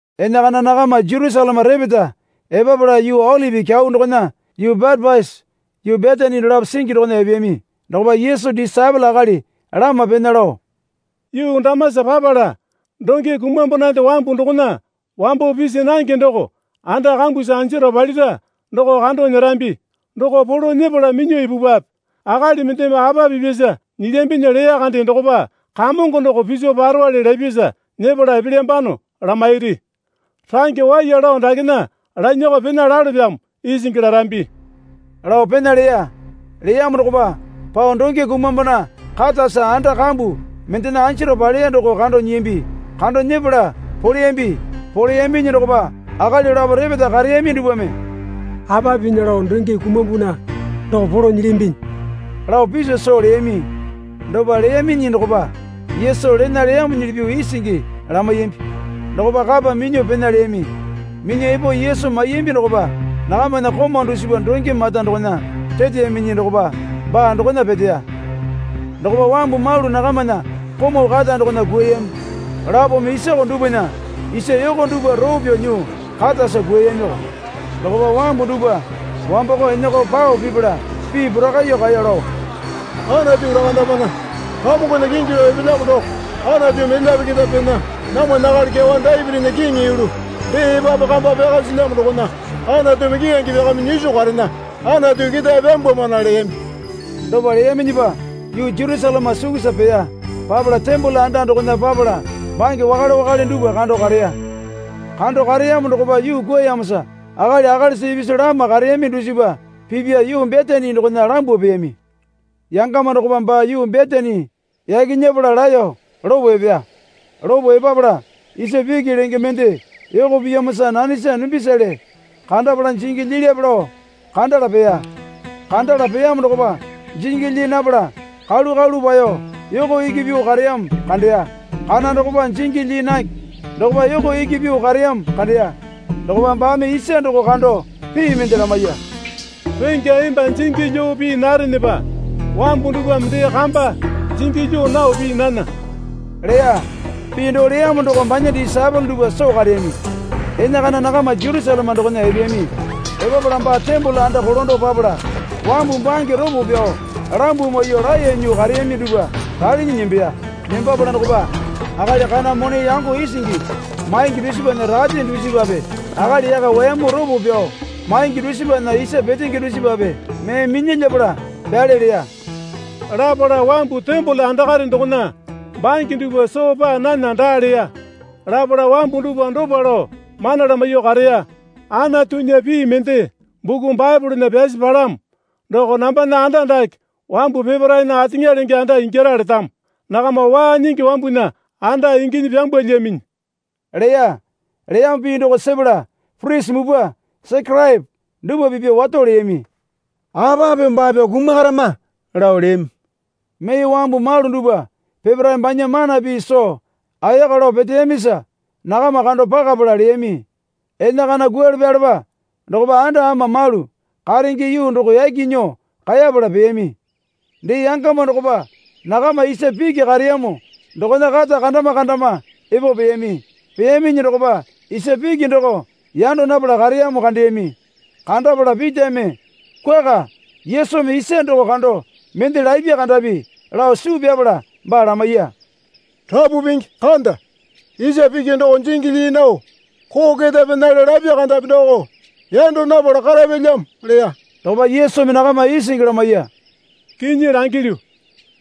Enakana nakama Jerusaleme repeta epapala yuu Olipi Kyau dokona yuu Betepasi yuu Betani dolapo singi dokona epeyami. Dokopa Yesu disaepole akali lama pena lao, Yuu damasa papala donge kumambonande wambu dokona wambo pisi nange doko anda kambusa anjaro palira doko kando nyerambi. Doko polo nyepala minyuo ipupwape. Akali mendeme apa pipyasa nyilyambinyi leya kande dokopa, Kamongo doko piso parowale lapyasa nyepala epelyambano lamairi. Range waiya lao dakena lanyakao pena lalopyamo, isingi larambi, lao pena leya. Leyamo dokopa pao donge kumambona katasa anda kambu mendena anjaro paleya doko kando nyiyambi. Kando nyepala poleyambi. Poleyambinyi dokopa akali lapo repeta kareyami dupwame, Apa pinya lao donge kumambona doko polo nyilyambinyi, lao piso soo leyami. Dopa leyaminyi dokopa Yesu lena leyamuli pyuo isingi lamaiyambi. Dokopa kapa minyuo pena leyami. Minyuo epo Yesu maiyambi dokopa nakamana komau dusipa donge mata dokona reteyaminyi dokopa baa dokona peteya. Dokopa wambu malu nakamana komau kata dokona kwuayami, lapome isoko dupwana isa yoko dupwa roo pyao nyuo katasa kwuayamiko. Dokopa wambu dupwa wamboko enako pao pipala pii porakaiyuo kaeyo lao, Anatu lakandamana. Kamongona kingi lao epelyamo doko Anatumi elyape keta pena. Namwana akali kyawa Dapitinya kiŋi yulu dee epapu kamba pyaka silyamo dokona Anatumi keyange pyakamyuo nyiso karena. Anatu ketae pyambwamana leyami. Dopa leyaminyipa yuu Jerusaleme sukusa peya. Papala tembole anda dokona papala bange wakale wakale dupwa kando kareya. Kando kareyamo dokopa yuu kwuayamosa akali akalisa ipisu lama kareyami dusipa pipya yuu Betani dokona lambuo peyami. Yangama dokopa baa yuu Betani yaki nyepala laeyo lopo epeya. Lopo epapala isa piki lenge mende yoko piyamosa nanesa dumbisale kandapala jingi lyilyape lao kandala peya. Kandala peyamo dokopa jingi lyii napala kalu kalu paeyo yoko iki pyuo kareyamo kandeya. Kana dokopa jingi lyii nange dokopa yoko iki pyuo kareyamo kandeya. Dokopa baame isa doko kando pii mende lamaiya. Rengya emba jingi lyuo pii narenepa wambu dupwame dee kamba jingi lyuo nao pii nana, leya. Pii doo leyamo doko banya disaepole dupwa soo kareyami. Enakana nakama Jerusaleme dokona epeyami. Epapala baa tembole anda kolando papala wambu bange ropo pyao lambuo maiyuo laeyo nyuo kareyami dupwa ralinyi nembeya. Nembapala dokopa akali kana mone yango isingi maingi dusipana rate dusipape akali yaka wayamu ropo pyao maingi dusipana isa petenge dusipape mee minyalyapala pyale leya. Lapala wambu tembole andakare dokona bange dupwa soo paa nana daa leya. Lapala wambu dupwa dopa lao mana lamaiyuo kareya. Anatunya pii mende buku Baepolena pyasi palamo. Doko nambana anda dake wambu peparaena ateŋa lenge anda ingyara letamo. Nakama waa nyingi wambunya anda inginyi pyambwalyaminyi leya. Leyamo pii doko sepala purisi mupwa Sekeraepo dupwa pipya wato leyami. Apa pyuo baa pyao kumarama? lao leyami. Mee wambu malu dupwa peparae banya mana pii soo ayaka lao peteyamisa nakama kando pakapala leyami. Enakana kwualepalepa dokopa anda ama malu karenge yuu doko yaki nyuo kaepala peyami. Dee yangama dokopa nakama isa piki kareyamo dokona kata kandama kandama epo peyami. Peyaminyi dokopa isa piki doko yando napala kareyamo kandeyami. Kandapala Pitame kwuaka Yesumi isa doko kando mende lapya kandapi lao suu pyapala baa lamaiya. Rapu Pingi, kanda. Isa piki doko jingi lyii nao koo keta penale lapi kandapi doko yando napala karapyalyamo, leya. Dokopa Yesumi nakama isingi lamaiya. Kinyi langilyu,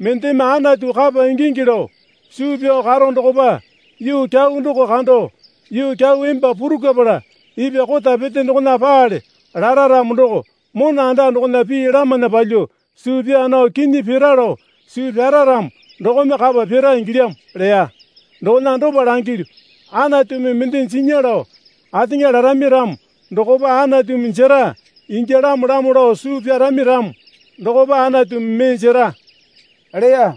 mendeme Anatu kapa ingingi lao suu pyao karo dokopa yuu kyau doko kando, yuu kyau emba purukwapala ipwa kota pete dokona paale lara ramo doko mona anda dokona pii lamana palyuo suu pyaa nao kinyi pira lao suu pyara ramo dokome kapa pira ingilyamo leya. Dokona dopa langilyu, Anatumi mende jinya lao ateŋa larami ramo dokopa Anatumi jera ingyalamolamo lao suu pyarami ramo dokopa Anatumi mee jera, leya.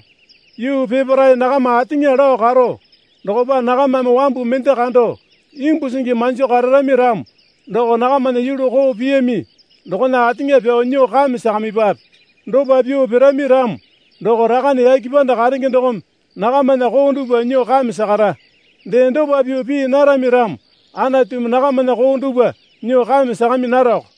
Yuu peparae nakama ateŋa lao karo dokopa nakamame wambu mende kando imbu singi manjo kararami ramo doko nakamana yulu koo piyami dokona ateŋa pyao nyuo kame sakamipwape. Dopa pyuo pirami ramo doko Rakane yake panda karenge dokome nakamana koo dupwa nyuo kame sakara. Dee dopa pyuo pii narami ramo Anatumi nakamana koo dupwa nyuo kame sakami narako.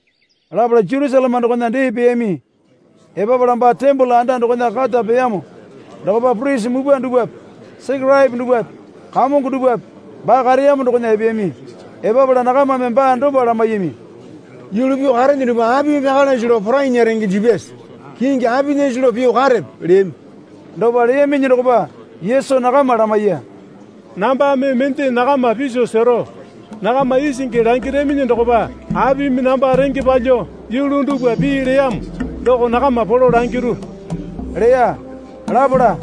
Lapala Jerusaleme dokona dee peyami. Epapala baa tembole anda dokona kata peyamo dokopa purisi mupwa dupwape Sekeraepo dupwape kamongo dupwape baa kareyamo dokona epeyami. Epapala nakamame baa dopa lamaiyami. Yulu pyuo karene dupwa apimi pyakalase lao porainya renge jipyase? Kingi apinyase lao pyuo karepe? leyami. Dopa leyaminyi dokopa Yesu nakama lamaiya. Nambame mende nakama piso sero. Nakama isingi langiraminyi dokopa apimi namba renge palyuo yulu dupwa pinya leyamo doko nakama polo langiru, leya. Lapala,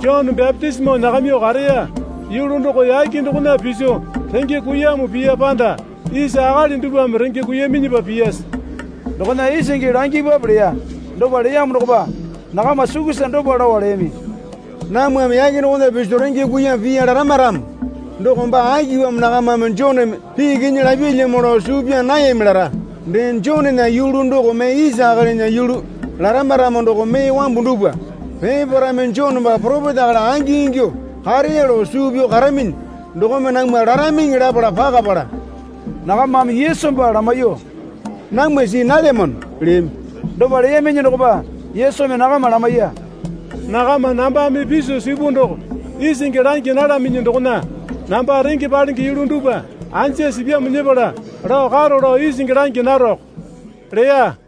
Jone bapitisimo nyakamyuo kareya yulu doko yake dokona piso renge kuiyamo piya panda isa akali dupwame renge kuiyaminyipa piyase? Dokona isingi langipwape leya. Dopa leyamo dokopa nakama sukusa dopa lao leyami. Namwame yake dokona piso renge kuiyamo piya larama ramo doko baa akipamo nakamame Joneme pii kinyi lapyalyamo lao suu pyaa nayami lara. Dee Jonena yulu doko mee isa akalinya yulu larama ramo doko mee wambu dupwa peparaeme Jone baa poropeta akali angingyuo kareya lao suu pyao karaminyi dokome namwa laramiŋi lapala pakapala, nakamame Yesu baa lamaiyuo, Namwa see nalyamano, leyami. Dopa leyaminyi dokopa Yesumi nakama lamaiya. Nakama nambame piso sipu doko isingi langi nalaminyi dokona namba renge palenge yulu dupwa anja sipyamo nyepala lao karo lao isingi langi naroko, leya.